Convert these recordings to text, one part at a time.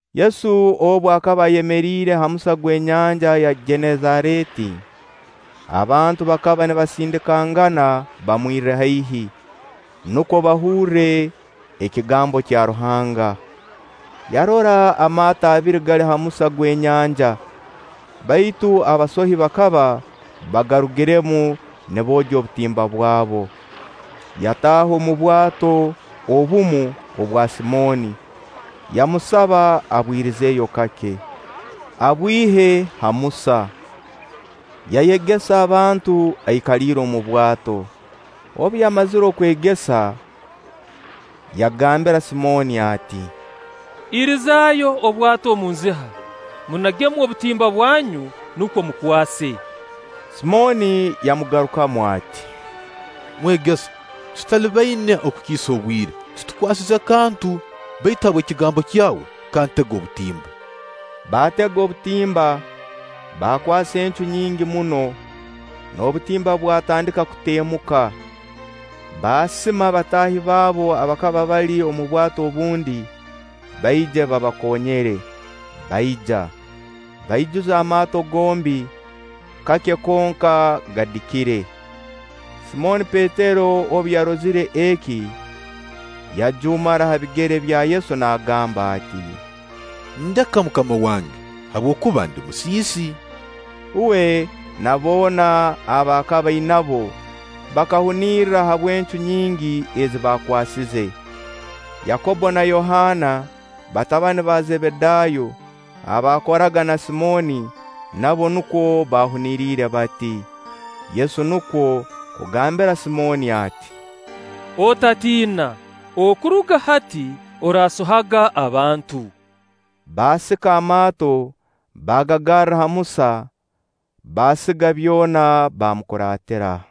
Yesu obu akaba ayemeriire ha musa gw'enyanja ya Genesareeti, abantu bakaba nibasindikangana bamwirre haihi, nukwo bahurre ekigambo kya Ruhanga. Yarora amaato abiri gali ha musa gw'enyanja; baitu abasohi bakaba bagarugiremu niboogya obutimba bwabo. Yataaha omu bwato obumu obwa Simooni, yamusaba abwirizeeyo kake, abwihe ha musa. Yayegesa abantu aikaliire omu bwato. Obu yamazire kwegesa, yagambira Simooni ati: “Irizaayo obwato omu nziha, munagemu obutimba bwanyu, nukwo mukwase.” Simooni yamugarukamu ati: “Mwegesa, tutalibaine okukiisa obwire, titukwasize kantu! Baitu habw'ekigambo kyawe kantege obutimba.” Baatega obutimba, baakwasa encu nyingi muno, n'obutimba bwatandika kutemuka. Baasima bataahi baabo abakaba bali omu bwato obundi, baije babakonyere. Baija, baijuza amaato gombi, kake konka gadikire. Simooni Petero obu yarozire eki, yajuumara ha bigere bya Yesu naagamba ati: “Ndeka MUKAMA wange, habwokuba ndi musiisi!” Uwe na boona aba akaba ainabo bakahunirra habw'encu nyingi ezi baakwasize. Yakobbo na Yohaana, batabani ba Zebedaayo abaakoraga na Simooni, nabo nukwo baahuniriire bati. Yesu nukwo kugambira Simooni ati: “Otatiina, okuruga hati oraasohaga abantu.” Baasika amaato, baagagarra ha musa, baasiga byona, baamukuratira.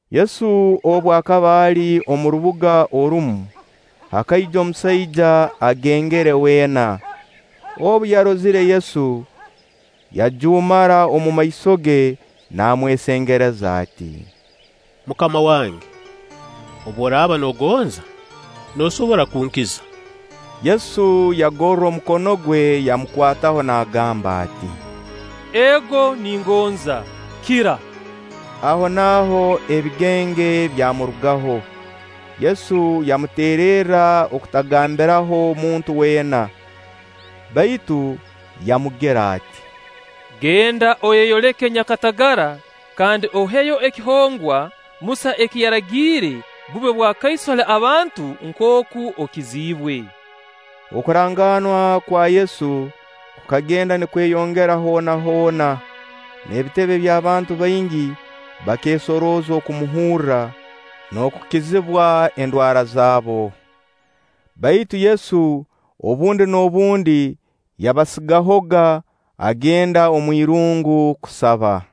Yesu obu akaba ali omu rubuga orumu, hakaija omusaija agengere weena. Obu yarozire Yesu, yajuumara omumaiso ge, namwesengereza ati: “MUKAMA wange, obu oraaba noogonza, noosobora kunkiza.” Yesu yagorra omukono gwe, yamukwataho, naagamba ati: “Ego ningonza, kira!” Ahonaaho ebigenge byamurugaho. Yesu yamuteererra okutagambiraho muntu weena, baitu yamugira ati: “Genda oyeyoleke nyakatagara, kandi oheyo ekihongwa Musa eki yaragiire bube bwakaiso hali abantu nkooku okiziibwe.” Okurangaanwa kwa Yesu kukagenda nikweyongera hoona hoona, n'ebitebe by'abantu baingi bakeesorooza kumuhurra n'okukizibwa endwara zaabo. Baitu Yesu obundi n'obundi yabasigahoga, agenda omu irungu kusaba.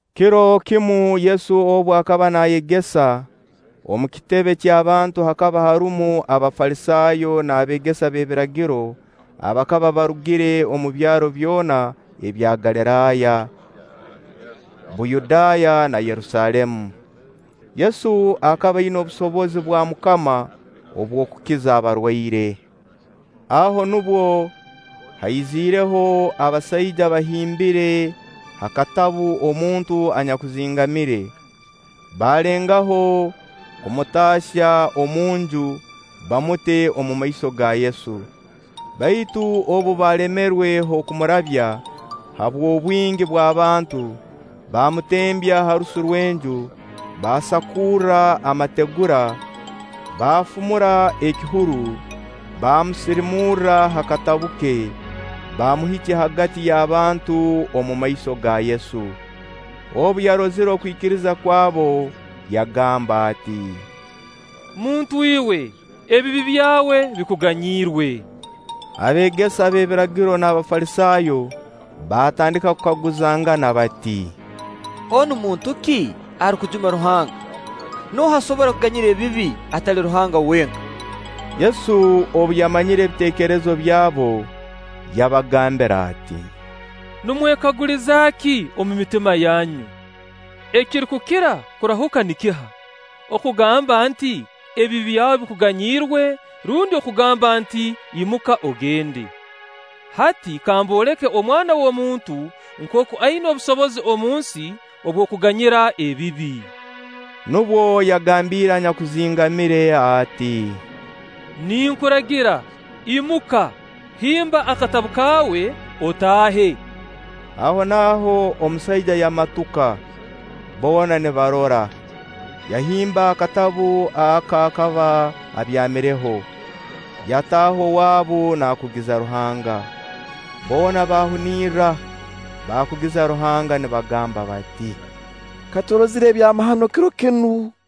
Kiro kimu Yesu obu akaba naayegesa, omu kitebe ky'abantu hakaba harumu Abafalisaayo n'abeegesa b'ebiragiro abakaba barugire omu byaro byona ebya Galiraaya, Buyudaaya, na Yerusaalemu. Yesu akaba aina obusobozi bwa MUKAMA obw'okukiza abarwaire. Aho nubwo haizireho abasaija bahimbiire ha katabu omuntu anyakuzingamire. Baalengaho kumutaahya omunju bamute omumaiso ga Yesu. Baitu obu baalemerwe h'okumurabya habw'obwingi bw'abantu, baamutembya ha rusu rw'enju, baasakurra amategura, baafumura ekihuru, baamusirimurra ha katabu ke, baamuhikya hagati y'abantu omumaiso ga Yesu. Obu yarozire okwikiriza kwabu, yagamba ati: “Muntu iwe, ebibi byawe bikuganyirwe.” Abeegesa b'ebiragiro n'Abafalisaayo baatandika kukaguzangana bati: “Onu muntu ki arukujuma Ruhanga? Nooha asobora kuganyira ebibi atali Ruhanga wenka?” Yesu obu yamanyire ebiteekerezo byabo, yabagambira ati: “Nimwekaguliza ki omu mitima yanyu? Ekirukukira kurahuka nikiha? Okugamba nti: ‘Ebibi byawe bikunganyirwe,’ rundi kugamba nti: ‘Imuka ogende.’ Hati kamboleke Omwana w'omuntu nkooku aina obusobozi omunsi obw'okuganyira ebibi.” Nubwo yagambiire anyakuzingamire ati: “Ninkuragira: Imuka, himba akatabu kaawe, otaahe!” Ahonaaho omusaija yamatuka, boona nibarora, yahimba akatabu aka akaba abyamireho, yataaha owaabu naakugiza Ruhanga. Boona baahunirra, baakugiza Ruhanga nibagamba bati: “Ka turozire ebyamahano kiro kinu!”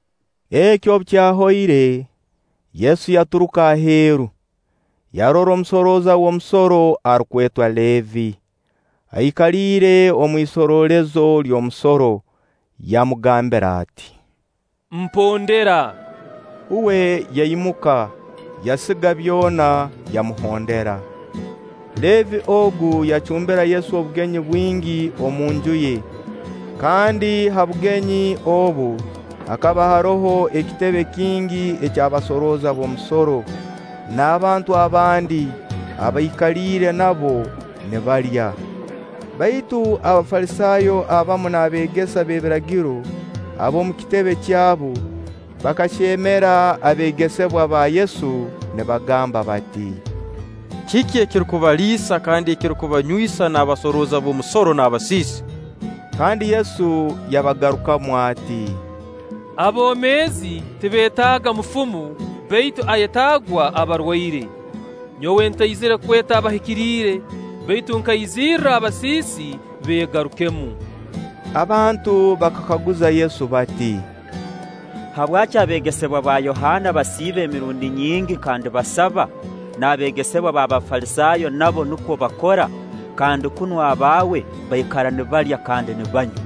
Eki obu kyahoire, Yesu yaturuka aheeru, yarora omusooroza w'omusoro arukwetwa Leevi, aikaliire omu isoroolezo ly'omusoro; yamugambira ati: “Mpondera.” Uwe yaimuka, yasiga byona yamuhondera. Leevi ogu yacumbira Yesu obugenyi bwingi omunju ye, kandi ha bugenyi obu, hakaba haroho ekitebe kingi eky'abasorooza b'omusoro, n'abantu abandi abaikaliire nabo nibalya. Baitu Abafalisaayo abamu n'abeegesa b'ebiragiro ab'omu kitebe kyabu bakahyemera abeegesebwa ba Yesu nibagamba bati: “Kiki ekirukubaliisa kandi ekirukubanywisa n'abasooroza b'omusoro n'abasiisi?” Kandi Yesu yabagarukamu ati: “Aboomeezi tibeetaaga mufumu, baitu ayetaagwa abarwaire. Nyowe ntaizirre kweta abahikiriire, baitu nkaizirra abasiisi, beegarukemu.” Abantu bakakaguza Yesu bati: “Habwaki abeegesebwa ba Yohaana basiiba emirundi nyingi kandi basaba, n'abeegesebwa b'Abafalisaayo nabo nukwo bakora; kandi kunu abaawe baikara nibalya kandi nibanywa?”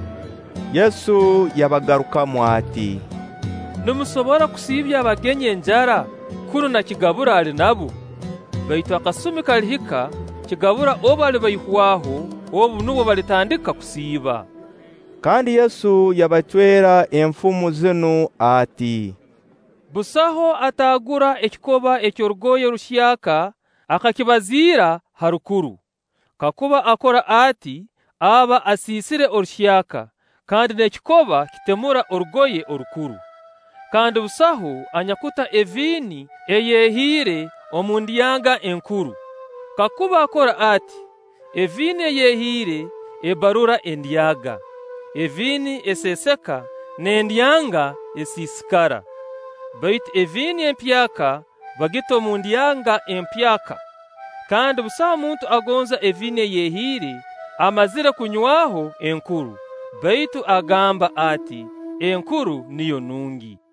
Yesu yabagarukamu ati: “Nimusobora kusiibya abagenyi enjara, kunu na kigabura ali nabo? Baitu akasumi kalihika kigabura obu alibaihwaho; obu nubwo balitandika kusiiba.” Kandi Yesu yabacwera enfumo zinu ati: “Busaho ataagura ekikoba eky'orugoye ruhyaka akakibazira ha rukuru; kakuba akora ati, aba asiisire oruhyaka, kandi n'ekikoba kitemura orugoye orukuru. “Kandi busaho anyakuta eviini ey'ehiira omu ndyanga enkuru. Kakuba akora ati, eviini ey'ehiira ebbarura endyanga, eviini eseeseka, n'endyanga esiisikara. Baitu eviini empyaka bagita omu ndyanga empyaka. Kandi busaho muntu agonza eviini ey'ehiira amazire kunywaho enkuru; baitu agamba ati: ‘Enkuru niyo nungi.’”